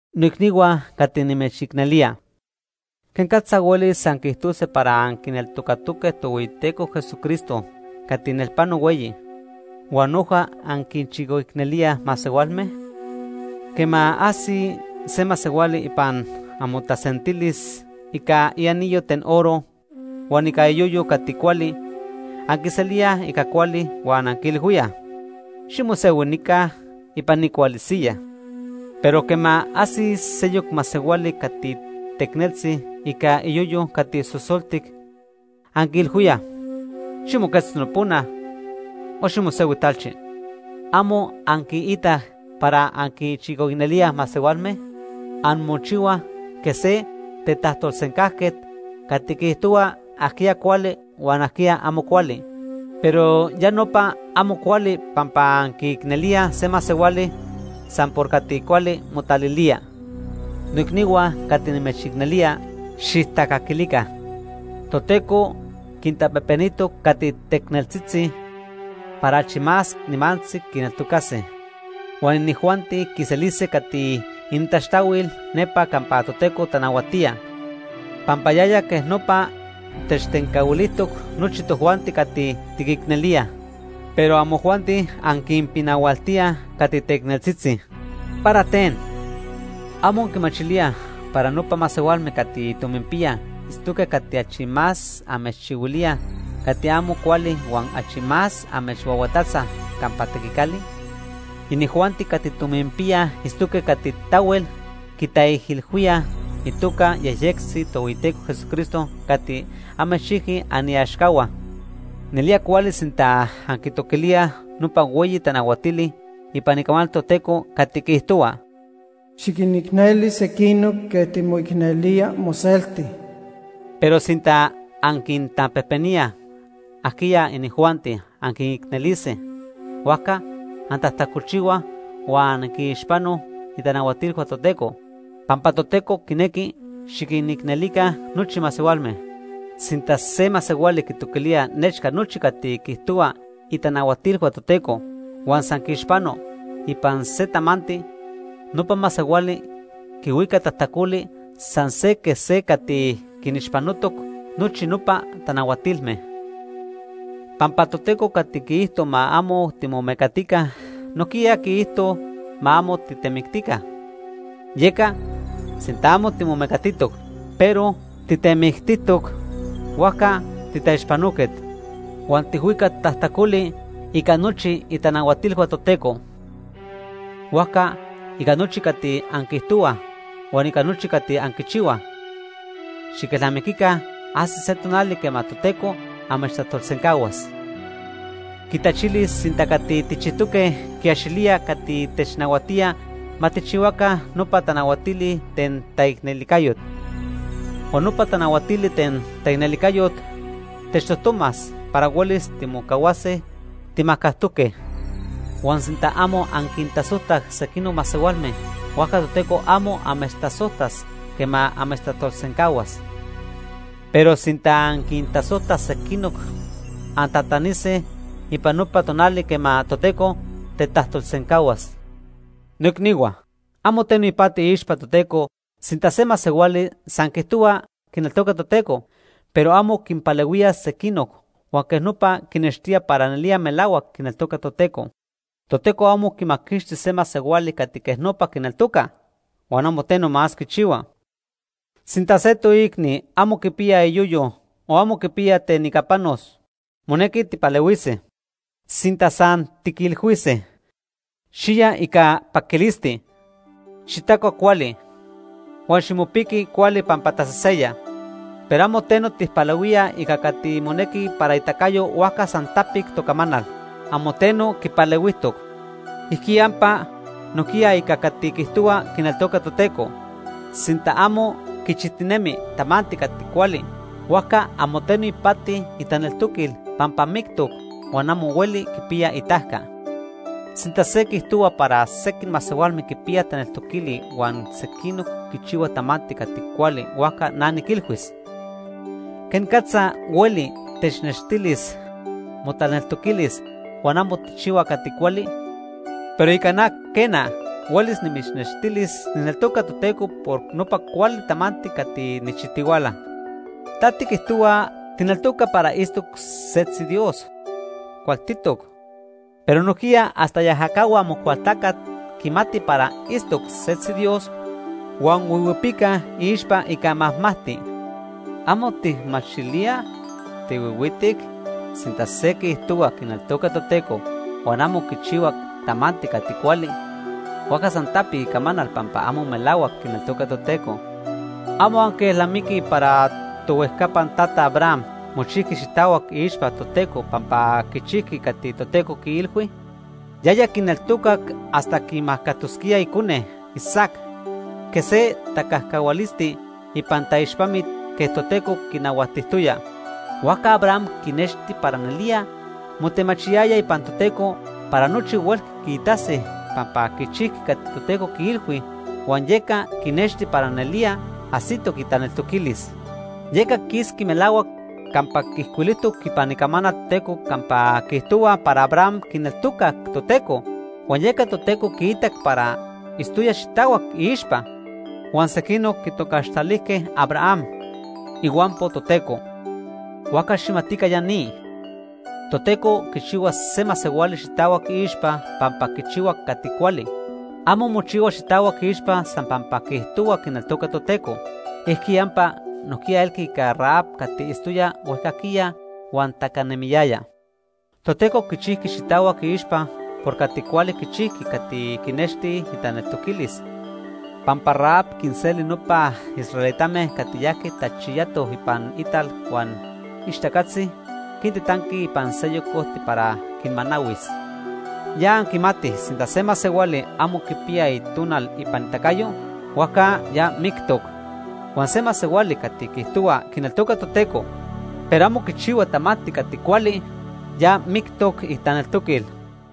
Noicnihua cati nimechicnelía, ¿quenicatza huelis anquiijtose para anquineltocatoque Tohueyiteco Jesucristo cati nelpano hueyi, huan noja anquinchicoicnelíaj masehualme? Quema ajsi se masehuali ipan amotasentilis ica ianillo ten oro huan ica iyoyo cati cuali, anquiselíaj ica cuali huan anquiilhuíaj: “Ximosehui nica ipan ni cuali siyaj.” Pero quema ajsi seyoc masehuali cati teicneltzi ica iyoyo cati sosoltic, anquiilhuíaj: “Ximoquetzto nopona o ximosehui talchi.” ¿Amo anquiitaj para anquinchicoicnelíaj masehualme? Anmochihuaj quej se tetajtolsencajquet cati quiijtohua ajquiya cuali huan ajquiya amo cuali. Pero ya nopa amo cuali pampa anquiicnelíaj se masehuali san por cati cuali motalilía. Noicnihua cati nimechicnelía, xijtacaquilica. Toteco quintapejpenijtoc cati teicneltzitzi para achi más nimantzi quineltocase. Huan inijuanti quiselise cati inintaxtahuil nepa campa Toteco tanahuatía, pampa yaya quej nopa techtencahuilijtoc nochi tojuanti cati tiquicnelíaj. Pero amojuanti anquinpinahualtíaj cati teicneltzitzi. ¿Para ten? ¿Amo anquimachilíaj para nopa masehualme cati tominpiyaj itztoque cati achi más amechchihuilíaj cati amo cuali huan achi más amechhuahuatatzaj campa tequicali? Inijuanti cati tominpiyaj itztoque cati tahuel quitaijilhuíaj itoca yejyectzi Tohueyiteco Jesucristo cati amechchijqui aniaxcahua. Nelía cuali sinta anquitoquilíaj nopa hueyi tanahuatili ipan Icamanal Toteco cati quiijtohua: “Xiquinicneli sequinoc quej timoicnelía moselti.” Pero sinta anquintapejpeníaj ajquiya inijuanti anquinicnelise, huajca antajtacolchihuaj huan anquinixpanoj itanahuatilhua Toteco, pampa Toteco quinequi xiquinicnelica nochi masehualme. Sinta se masehuali quitoquilía nechca nochi cati quiijtohua itanahuatilhua Toteco, huan san quiixpano ipan se tamanti, nopa masehuali quihuica tajtacoli san se quej se cati quinixpanotoc nochi nopa tanahuatilme. Pampa Toteco cati quiijto ma amo timomecatica, nojquiya quiijto ma amo titemictica. Yeca sinta amo timomecatijtoc, pero titemictijtoc, huajca titaixpanoquet. Huan tijhuica tajtacoli ica nochi itanahuatilhua Toteco. Huajca ica nochi cati anquiijtohuaj huan ica nochi cati anquichihuaj, xiquelnamiquica ajsis se tonali quema Toteco amechtajtolsencahuas. Quitachilis sinta cati tijchijtoque quiaxilía cati technahuatía ma tijchihuaca nopa tanahuatili ten taicnelijcayot. Huan nopa tanahuatili ten taicnelijcayot techtojtomas para huelis timocahuase timajcajtoque. Huan sinta amo anquintasojtaj sequinoc masehualme, huajca Toteco amo amechtasojtas quema amechtajtolsencahuas. Pero sinta anquintasojtaj sequinoc, antatanise ipan nopa tonali quema Toteco tetajtolsencahuas. Noicnihua, amo teno ipati iixpa Toteco sinta se masehuali san quiijtohua quineltoca Toteco, pero amo quinpalehuía sequinoc huan quej nopa quinextía para nelía melahuac quineltoca Toteco. Toteco amo quimaquixtis se masehuali cati quej nopa quineltoca, huan amo teno más quichihua. Sinta se toicni amo quipiya iyoyo o amo quipiya ten ica panos, monequi tijpalehuise. Sinta san tiquilhuise: “Xiya ica paquilisti, xitacua cuali, huan ximopiqui cuali pampa taseseya”, pero amo teno tijpalehuíaj ica cati monequi para itacayo, huajca san tapic tocamanal. Amo teno quipalehuijtoc. Ijquiyampa nojquiya ica cati quiijtohua quineltoca Toteco. Sinta amo quichijtinemi tamanti cati cuali, huajca amo teno ipati itaneltoquil pampa mictoc huan amo hueli quipiya itajca. Sinta se quiijtohua para sequij masehualme quipiya taneltoquili huan sequinoc quichihuaj tamanti cati cuali huajca na niquilhuis: ¿quenicatza hueli technextilis motaneltoquilis huan amo tijchihua cati cuali? Pero ica na, quena, huelis nimitznextilis nijneltoca Toteco por nopa cuali tamanti cati nijchijtihuala. Ta tiquijtohua tijneltoca para itztoc setzi Dios. Cualtitoc. Pero nojquiya hasta iajacahua Amocualtacat quimatij para itztoc setzi Dios huan huihuipicaj iixpa ica majmajti. ¿Amo tijmachilía? ¿Tihuihuitic? Sinta se quiijtohua quineltoca Toteco huan amo quichihua tamanti cati cuali, huajca san tapic icamanal pampa amo melahuac quineltoca Toteco. ¿Amo anquielnamiquij para tohuejcapan tata Abraham mochijqui xitahuac iixpa Toteco pampa quichijqui cati Toteco quiilhui? Yaya quineltocac hasta quimacatosquía icone, Isaac, quej se tacajcahualisti ipan taixpamit quej Toteco quinahuatijtoya. Huajca Abraham quinexti para nelía motemachiyaya ipan Toteco para nochi huelqui quiitase pampa quichijqui cati Toteco quiilhui huan yeca quinexti para nelía ajsitoc itaneltoquilis. Yeca quisqui melahuac campa ijcuilijtoc ipan Icamanal Toteco campa quiijtohua para Abraham quineltocac Toteco, huan yeca Toteco quiitac para itztoya xitahuac iixpa. Huan sequinoc quitocaxtalijque Abraham “ihuampo Toteco”. Huajca xijmatica ya ni; Toteco quichihua se masehuali xitahuac iixpa pampa quichihua cati cuali. Amo mochihua xitahuac iixpa san pampa quiijtohua quineltoca Toteco. Ijquiyampa nojquiya elqui ica Rahab cati itztoya huejcajquiya huan tacanemiyaya. Toteco quichijqui xitahuac iixpa por cati cuali quichijqui cati quinexti itaneltoquilis; pampa Rahab quinseli nopa israelitame cati yajque tachiyatoj ipan ital huan ixtacatzi quintitanqui ipan seyoc ojti para quinmanahuis. Ya anquimatij sinta se masehuali amo quipiya itonal ipan itacayo, huajca ya mictoc. Huan se masehuali cati quiijtohua quineltoca Toteco, pero amo quichihua tamanti cati cuali, ya mictoc itaneltoquil.